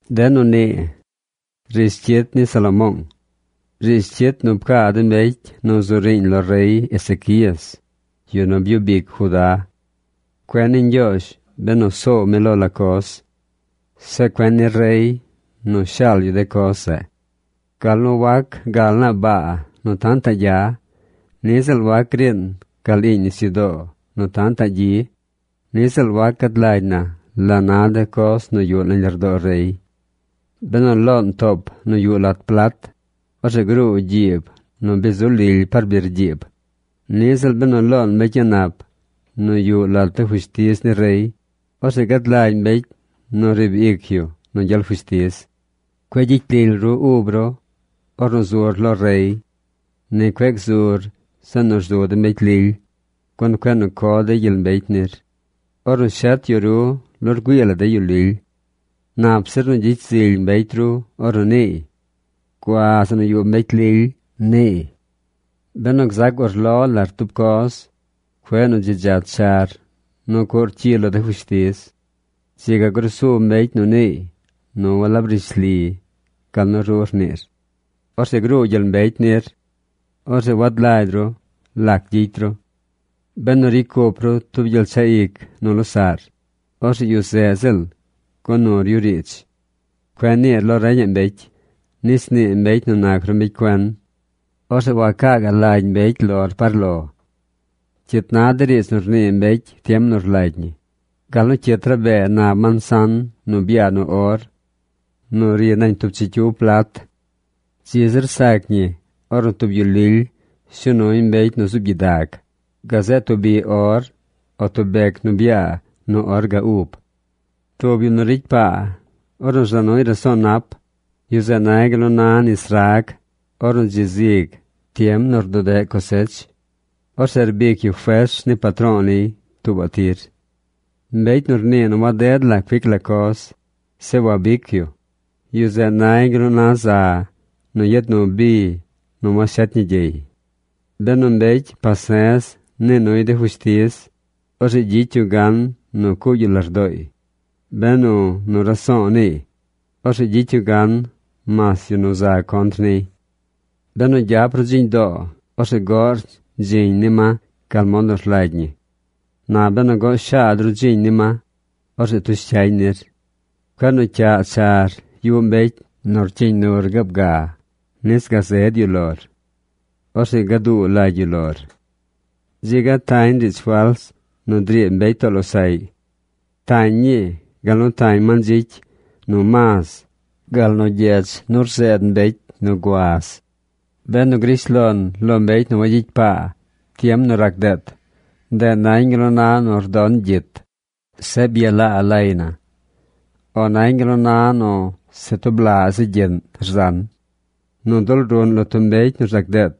De nu nii riidz cyit ni Salomoong, riidz cyit nu pcaa de mbecy nu zu riiñ lo rey Ezequías, yu nu byub ic Judá. Cuen ni Ñgyoozh benu soow mi lo la coz. Zeꞌ cuen ni rey nu shaal yu de coz zeꞌ. Gal nu wac gal naa baa nu tantaꞌ gya. Niꞌ ziꞌl wac griin gal iiñ nisyudoo nu tantaꞌ gyi. Niꞌ ziꞌl wac gad lagy na la na de coz nu yuꞌ nañ lardoo rey. Benu loon toop nu yuꞌ lat plat, orzeꞌ gruu gyiib nu bi zu lily par birgyiib. Niꞌ ziꞌl benu loon mbecy a̱ꞌ nap nu yuꞌ lat de fushtiz ni rey, orzeꞌ gad lagy mbecy nu riib ic yu nu gyel fushtiz. Cueꞌ gyicy lily ru ub ru ornu zur lo rey. Ni cueꞌ gzur zeꞌ nu rzu de mbecy lily, gun cueꞌ nu co dey gyel mbecy nir ornu shet yu ru lo rgüii la de yu lily. Nap zir nu gyicy zily mbecy ru ornu rniiy: “Gua zeꞌ nu yuꞌ mbecy lily”, rniiy. Benu gzac urlo lar tub coz, cueꞌ nu dzi dzach char nu cuꞌr cyi lo de fushtiz. Dzi ga grusu mbecy nu niiy nu walab rishli gal nu ru rniir. Orzeꞌ gruu gyel mbecy nir. Orzeꞌ wad lagy ru lac gyicy ru. Benu ricy cup ru tub gyel dzaꞌ ic nu losaꞌr, orzeꞌ yu zeꞌ ziꞌl go nur yu riidz. Cueꞌ niir lo reñaꞌ mbecy, nis nii mbecy nu nac ru mbecy cuen. Orzeꞌ wacaa gaꞌ lagy mbecy lor par lo. Cyit na de riidz nu rnii mbecy tiem nu rlagy ñi gal nu cyit rabee nab mansan nu byaa nu or nu ri nañ tub chicyiw plat. Dzi zir sac ñi ornu tub yu lily shuu nuy mbecy nu zuub gyidag gazeꞌ tub biꞌ or o tub bec nu byaa nu or ga ub. Tub yu nu ricy paa ornu rza nuy raso̱o̱ nap, yu zeꞌ nay gal nu na nis rag ornu dzi zig tiem nu rdudeꞌ cosech. Orzeꞌ rbic yu fers ni patro̱o̱ niy tuubaꞌ tir. Mbecy nu rnii nu waded la cuic la coz, zeꞌ wabic yu, yu zeꞌ nay gal nu na za nu yad nu bi nu washet ñi gyey. Benu mbecy pase̱z nii nuy de fushtiz, orzeꞌ gyicy yu gan nu cuugy yu lardooy. Benu nu raso̱o̱ niiy, orzeꞌ gyicy yu gan mas yu nu za contr niy. Benu gyap ru dziñ doo, orzeꞌ goꞌr dziñ ni ma gal mod nu rlagy ñi. Na benu goꞌ shaad ru dziñ ni ma, orzeꞌ tush cyañ nir. Cueꞌ nu cyaꞌ char yuꞌ mbecy nu rcyiiñ nur gaab ga nis gazed yu lor. Orzeꞌ gaduu lagy yu lor. Dzi ga tañ riidz fals nu driib mbecy too losaꞌy. Tañ ñii gal nu tañ mandzicy, nu maz, gal nu gyech nu rzeed mbecy nu guaz. Benu grish lon lo mbecy wagyicy paa tiem nu rac deet, ndeꞌ nañ gal nu na nu rdon gyit, zeꞌ byalaa lay na, o nañ gal nu na nu se tub laꞌ zi gyiꞌn rzan. Nu dul ruꞌn lo tub mbecy nu rzac deet,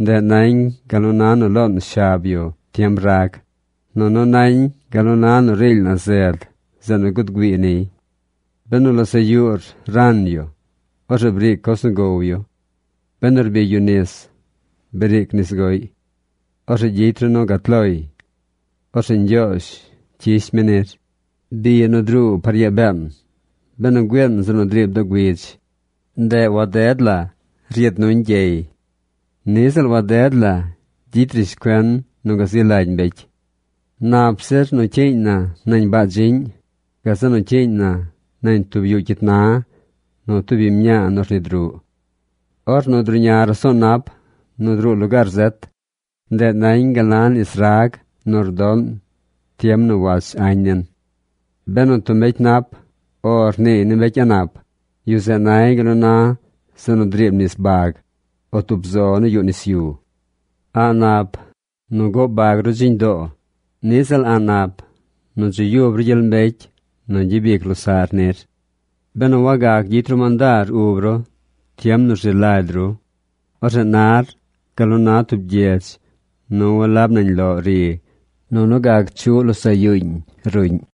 ndeꞌ nañ gal nu na nu loon shab yu tiem rag, nunu nañ gal nu na nu riily na zed zeꞌ nu gud güii niy. Benu losaꞌ yuur ran yu, orzeꞌ briic coz nu gow yu. Benu rbigy yu nis, briic nis goꞌy. Orzeꞌ gyicy ru nu gat loy. Orzeꞌ Ñgyoozh cyish mi nir. Bi nu druu par yaa been benu güiin zeꞌ nu driib doo güidz, ndeꞌ waded la yad nuñ gyey. Niꞌ ziꞌl waded la gyicy rishcuen nu gazi lagy mbecy. Nap zir nu cyiiñ na nañ baa dziꞌñ, gazeꞌ nu cyiiñ na nañ tub yuꞌ cyit na nu tub biñ mñaa nu rnid ruꞌ. Ornu druꞌña raso̱o̱ nap nu druu lugaar zet, ndeꞌ nañ gal nu na nis rag nu rdoꞌn tiem nu wach añ nin. Benu tub mbecy nap “O” rniiy ni mbecy a̱ꞌ nap, yu zeꞌ nay gal nu na zeꞌ nu driib nis bag, o tub zo nu yuꞌ nis yu. A̱ꞌ nap nu goꞌ bag ru dziñ doo. Niꞌ ziꞌl a̱ꞌ nap nu dzi yub ru gyel mbecy nu gyabic losaꞌr nir. Benu wagac gyicy ru mandaar ub ru tiem nu rzi lagy ru, orzeꞌ nar gal nu na tub gyedz nu walab nañ loꞌ ri, nunu gac chuꞌ losaꞌ yuuñ ruꞌñ.